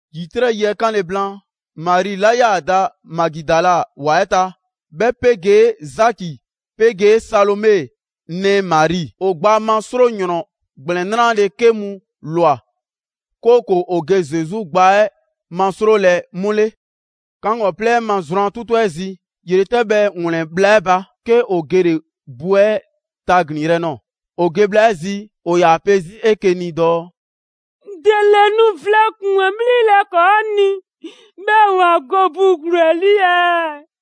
‑Yitrɛ' yi 'ɛ 'kanle‑ blaan, Mari 'la 'yaa‑ da Magidala ‑wa 'ɛ ta, 'bhɛ 'pegee Zaki 'pegee Salome nɛɛ Mari, ‑o gbaa ma 'sro ‑yrɔn ‑gblɛn 'nrale‑ 'ke mu ꞊lwa, 'kooko‑ ‑o ge Zesu gbaa 'ɛ masrolɛ 'mu 'le. 'Kaŋgɔplɛ 'ɛ ma zrwan 'tutu 'ɛ zi, ‑yretɛbhɛ ‑wlɛn bhla 'ɛ ba, 'ke ‑o gele‑ bu 'ɛ taglinyrɛ꞊nɔɔ. ‑O ge bhla 'ɛ zi, ‑o ‑yaa pe 'zi 'eke‑ ni dɔɔ: «‑Dele nu vlɛ ‑kpuŋ 'ɛ 'bhlilɛ‑ ‑kɔɔ' ni, 'bhɛɛ‑ ‑ya go bu ‑gluu 'ɛ 'lii ɛɛ?»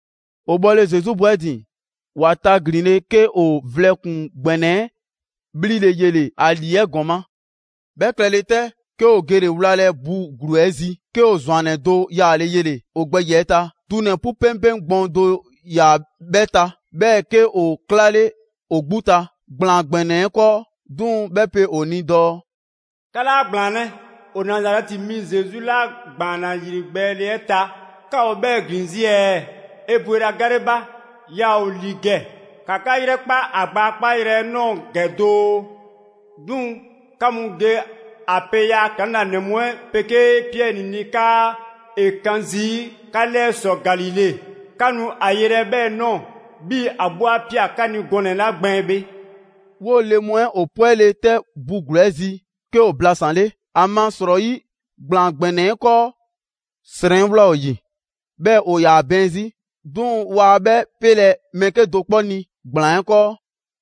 ‑O bhɔle Zesu bu 'ɛ ‑din, ‑wa taglinle, 'ke ‑o vlɛ ‑kpuŋ ‑gbɛnɛ 'ɛ 'bhlile‑ yele‑ ‑a 'lii 'ɛ ‑gɔma'. 'Bhɛ klɛle 'tɛ, 'ke ‑o gele‑ wlalɛ bu ‑gluu 'ɛ zi, 'ke ‑o ‑zwannɛ do yaale yele‑ ‑o gbɛ ‑yiɛ' ta, dunɛ‑ 'pu 'peŋpeŋ gbɔɔn do ‑yaa 'bhɛ ta, 'bhɛɛ‑ 'ke ‑o 'klale ‑o 'gbu ta ‑gblaan ‑gbɛnɛ 'ɛ 'kɔɔ. 'Duŋ‑ 'bhɛ pe ‑o ni dɔɔ: «'Ka 'laa ‑gblaanlɛ, ‑o Nazarɛti mi Zesu 'la ‑gbaanna ‑yrigbɛɛle 'ɛ ta, 'ka ‑o 'bhɛɛ‑ ‑glin zii' ɛɛ? ‑E ‑bwela gale ba, yaa ‑o ‑li ‑gɛ, ‑ka 'ka 'yrɛkpa ‑a gbaa 'kpaayrɛ‑ 'ɛ ꞊nɔɔ ‑gɛ doo. 'Duŋ‑, 'ka mu ge a pe ‑yaa' ‑klaŋlanɛ mu 'ɛ 'pegee Piɛri ni 'kaa ‑e 'kan zii' 'ka 'lɛɛ ‑sɔ Galile. 'Ka nu a yelɛ 'bhɛɛ‑ ꞊nɔɔ 'bhii‑ ‑a 'gbu 'a ꞊pia 'ka ni gɔnɛ‑ 'la ‑gbɛɛn bhe.» 'Woo‑ le mu 'ɛ 'pwele‑ 'tɛ bu ‑gluu 'ɛ zi, 'ke ‑o blasanle, ‑amasrɔyi ‑gblaan ‑gbɛnɛ 'ɛ 'kɔɔ srɛn ꞊wlaa ‑o ‑yi, 'bhɛɛ‑ ‑o ‑yaa bɛɛn 'zi. 'Duŋ‑ waa 'bhɛ 'pele mɛɛ 'kedo‑ 'kpɔ ni ‑gblaan 'ɛ 'kɔɔ.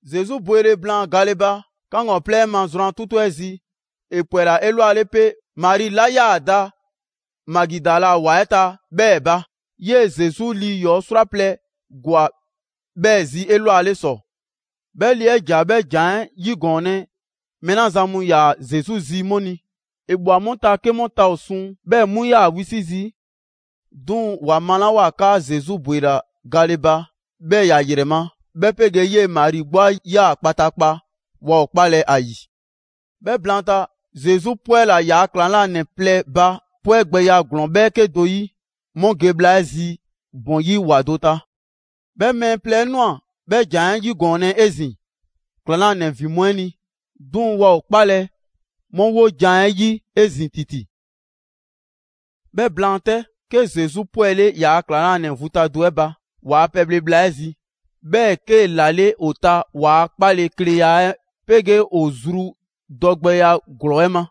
[Zesu bwele blaan gale ba, 'kaŋgɔplɛ 'ɛ ma zrwan 'tutu 'ɛ zi, ‑e ‑pwɛla 'elwale 'pe Mari 'la 'yaa‑ da Magidala ‑wa 'ɛ ta 'bhɛɛ‑ ba. 'Yee‑ Zesu lii 'yɔɔ‑ 'srwaplɛ‑ ‑gwa 'bhɛɛ‑ zi 'elwale ‑sɔ. 'Bhɛ le 'ɛ ‑ja 'bhɛ ‑jan 'ɛ 'yigɔɔnlɛ mɛɛ 'la zan mu ‑yaa Zesu zi 'mu ni; ‑e ꞊bhwa 'mu ta 'ke mu ta ‑o suŋ, 'bhɛɛ‑ 'mu 'yaa‑ wisi' zii'. 'Duŋ‑ ‑wa malawoa 'kaa Zesu ‑bwela gale, 'bhɛɛ‑ ‑ya ‑yrɛ ma, 'bhɛ 'pegee 'yee‑ Mari 'gbu 'a ꞊ya kpataakpa, waa ‑o 'kpalɛ‑ ‑a ‑yi. 'Bhɛ blaanta, Zesu 'pwɛla‑ ‑yaa' ‑klaŋlanɛ plɛ ba 'pwɛgbɛya ‑glɔɔn 'bhɛɛke do 'yi 'mu ge bhla 'ɛ zi ‑bɔn 'yi ‑wa do ta. 'Bhɛ mɛɛ plɛ 'ɛ ꞊nwa 'bhɛ ‑jan 'ɛ 'yigɔɔnlɛ 'ezin‑ ‑klaŋlanɛ ‑vin mu 'ɛ ni, 'duŋ‑ waa ‑o 'kpalɛ‑ 'mu 'wojan‑ 'ɛ 'yi 'ezin‑ ‑titi. 'Bhɛ blaan 'tɛ, 'ke Zesu 'pwɛle‑ ‑yaa' ‑klaŋlanɛ vu ta do 'ɛ ba, ‑waa' pɛbhle bhla 'ɛ zi. 'Bhɛɛ‑ 'kee‑ ‑lale' ‑o ta ‑waa' 'kpalekleya 'ɛ 'pegee ‑o zru dɔgbɛya ‑glɔɔ 'ɛ ma.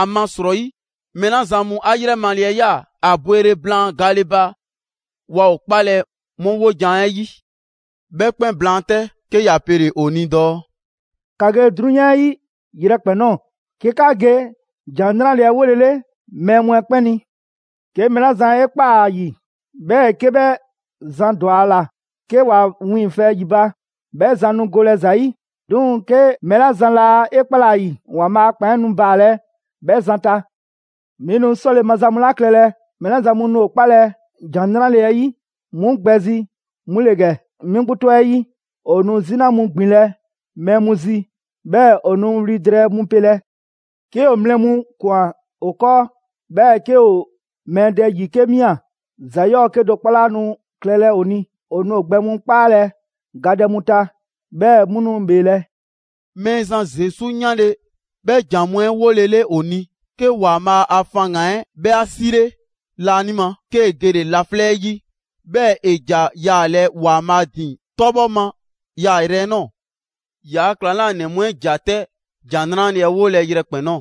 ‑Amasrɔyi, mɛɛ 'la zan mu 'a 'yrɛmale 'ɛ ꞊ya ‑a bwele blaan gale ba, waa ‑o 'kpalɛ‑ 'mu 'wojan‑ 'ɛ 'yi. 'Bhɛ 'kpɛn blaan 'tɛ, 'ke ‑ya pele‑ ‑o ni dɔɔ: «‑Ka ge 'drunyan 'ɛ 'yi yrɛkpɛn‑ ꞊nɔɔ, 'ke 'ka ge ‑Jan 'Nrale‑ 'ɛ 'wolele mɛɛ mu 'ɛ 'kpɛn ni. 'Ke mɛɛ 'la zan 'e ꞊kpaa ‑a ‑yi, 'bhɛɛ‑ 'ke 'bhɛ zan ‑dwa ‑a ‑la 'ke ‑wa wiiŋfɛ ‑yi ba, 'bhɛ zan nu golɛ ‑za 'yi. 'Duŋ‑ 'ke mɛɛ 'la zan 'laa 'e 'kpalɛ‑ ‑a ‑yi, ‑Waanbhaa' a ‑kpan 'ɛ nu baalɛ 'bhɛ zan ta. 'Mi nu 'sɔle‑ maza mu 'la klɛlɛ mɛɛ 'la zan mu nu ‑o 'kpalɛ‑ ‑Jan 'Nrale‑ 'ɛ 'yi 'mu gbɛ zi 'mu ‑le ‑gɛ: 'Mi 'gbu 'tɔ 'ɛ 'yi, ‑o nu 'zina mu ‑gbinlɛ' mɛɛ mu zi, 'bhɛɛ‑ ‑o nu wli drɛɛ mu 'pele. 'Ke ‑o mlɛ mu ꞊kwan ‑o 'kɔɔ, 'bhɛɛ‑ 'ke ‑o mɛɛ dɛ ‑yi 'ke ꞊mia, ‑za 'yɔɔ‑ 'kedo‑ 'kpɔ 'laa nu klɛlɛ ‑o ni. ‑O nu ‑o gbɛ mu 'kpaalɛ‑ gadɛ mu ta 'bhɛɛ‑ 'mu nu ‑bheelɛ'.» Mɛɛzan Zesu 'yanle‑ 'bhɛ ‑jan mu 'ɛ 'wolele ‑o ni, 'ke ‑Waanbhaa' ‑a faŋgan‑ 'ɛ 'bhɛ 'a 'sile laanima, 'kee‑ gele‑ laflɛ' 'ɛ 'yi, 'bhɛɛ‑ ‑e ‑ja yaalɛ ‑Waanbhaa' ‑din 'tɔbhɔ ma yaayrɛ 'ɛ ꞊nɔɔ. ‑Yaa' ‑klaŋlanɛ mu 'ɛ ‑ja 'tɛ ‑Jan 'Nrale‑ 'ɛ 'wolɛ‑ yrɛkpɛn‑ ꞊nɔɔ.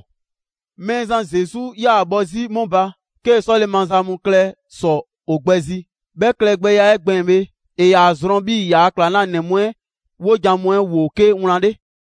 Mɛɛzan Zesu 'yaa‑ bhɔ 'zi 'mu ba, 'kee‑ 'sɔle‑ maza mu klɛ ‑sɔ ‑o gbɛ zi. 'Bhɛ klɛgbɛya 'ɛ gbɛɛn‑ bhe, ‑e ‑yaa zrɔn 'bhii‑ ‑yaa' ‑klaŋlanɛ mu 'ɛ 'wojan‑ mu 'ɛ ‑woo 'ke wlan 'le.]